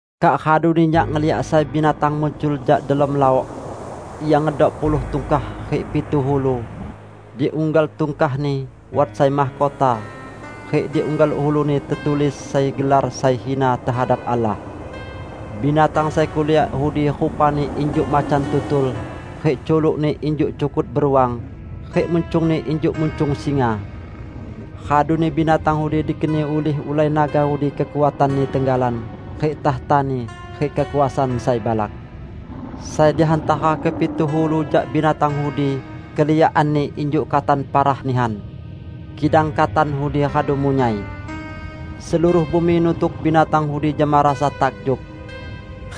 Kak raduni nyak ngeliak sai binatang muncul jak delom laok. Ia ngedok puluh tungkah rik pitu ulu. Di unggal tungkahni wat sai mahkota, rik di unggal uluni tetulis sai gelar sai hina tehadap Allah. Binatang sai kuliak udi rupani injuk macan tutul, rik culukni injuk cukut beruang, rik muncungni injuk muncung singa. Raduni binatang udi dikeni ulih ulai naga udi kekuatanni tenggalan, rik takhtani, rik kekuasaan sai balak. Sai di hantara kepitu ulu jak binatang udi keliakanni injuk katan parah nihan, kidang katan udi radu munyai. Seluruh bumi nutuk binatang udi jama rasa takjub.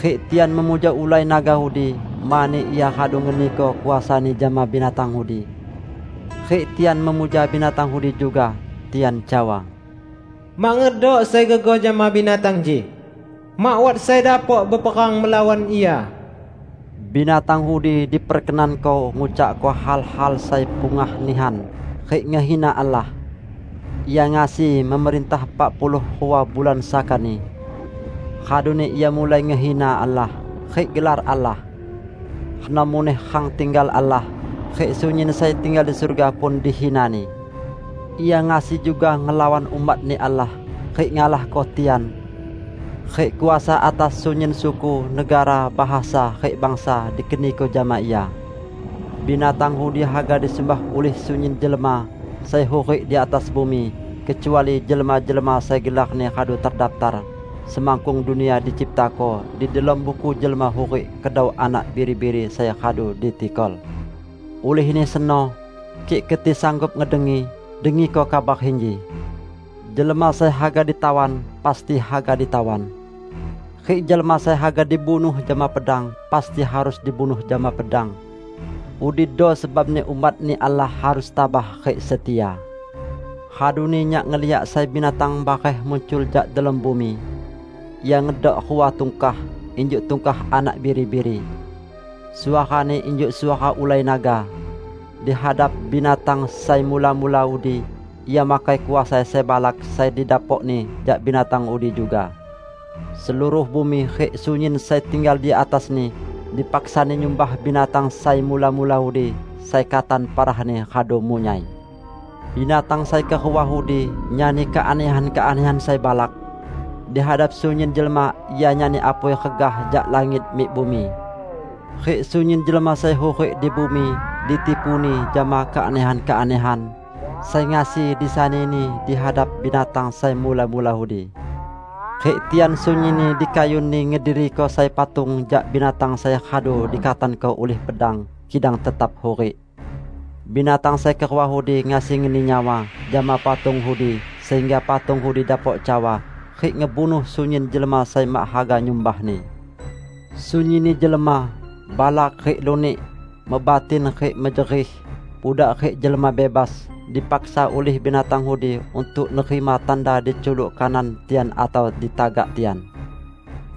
Rik tian memuja ulai naga udi mani ia radu ngeniko kuasani jama binatang udi. Rik tian memuja binatang udi juga. Tian cawa, "Mak ngedok sai gegoh jama binatang inji! Mak wat sai dapok beperang melawan ia!" Binatang udi diperkenanko ngucakko hal-hal sai pungah nihan rik ngehina Allah. Ia ngasi memerintah epak puluh rua bulan sakani. Raduni ia mulai ngehina Allah, rik gelar Allah. Reno muneh rang tinggal Allah, rik sunyin sai tinggal di surga pun dihinani. Ia ngasi juga ngelawan umat-Ni Allah rik ngalahko tian. Rik kuasa atas sunyin suku, negara, bahasa, rik bangsa dikeniko jama ia. Binatang udi haga disumbah ulih sunyin jelma sai hurik di atas bumi, kecuali jelma-jelma sai gelarni radu terdaptar semakkung dunia diciptako, di delom buku jelma hurik kedau Anak Biri-biri sai radu ditikol. Ulihni seno, kik keti sanggup ngedengi, dengiko kabar inji: "Jelma sai haga ditawan, pasti haga ditawan. Rik jelma sai haga dibunuh jama pedang, pasti harus dibunuh jama pedang. Udido sebabni umat-Ni Allah harus tabah rik setia." Raduni nyak ngeliak sai binatang bareh muncul jak delom bumi. Ia ngedok rua tungkah injuk tungkah anak biri-biri. Suarani injuk suara ulai naga. Di hadap binatang sai mula-mula udi ia makai kuasa sai balak sai didapokni jak binatang udi juga. Seluruh bumi rik sunyin sai tinggal di atasni, dipaksani nyumbah binatang sai mula-mula udi, sai katan parahni radu munyai. Binatang sai kerua udi nyani keanehan-keanehan sai balak. Di hadap sunyin jelma ia nyani apui regah jak langit mik bumi. Rik sunyin jelma sai hurik di bumi ditipuni jama keanehan-keanehan sai ngasi disanini di hadap binatang sai mula-mula udi. Rik tian sunyinni dikayunni ngediriko sai patung jak binatang sai radu dikatanko ulih pedang, kidang tetap hurik. Binatang sai kerua udi ngasi ngeni nyawa jama patung udi, sehingga patung udi dapok cawa rik ngebunuh sunyin jelma sai mak haga nyumbahni. Sunyinni jelma, balak rik lunik, mebatin rik mejerih, budak rik jelma bebas, dipaksa ulih binatang udi untuk nerima tanda di culuk kanan tian atau di tagak tian.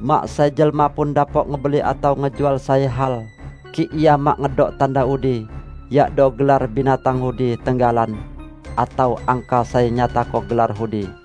Mak sai jelma pun dapok ngebeli atau ngejual sai hal, kik ia mak ngedok tanda udi, yakdo gelar binatang udi tenggalan, atau angka sai nyatako gelar udi.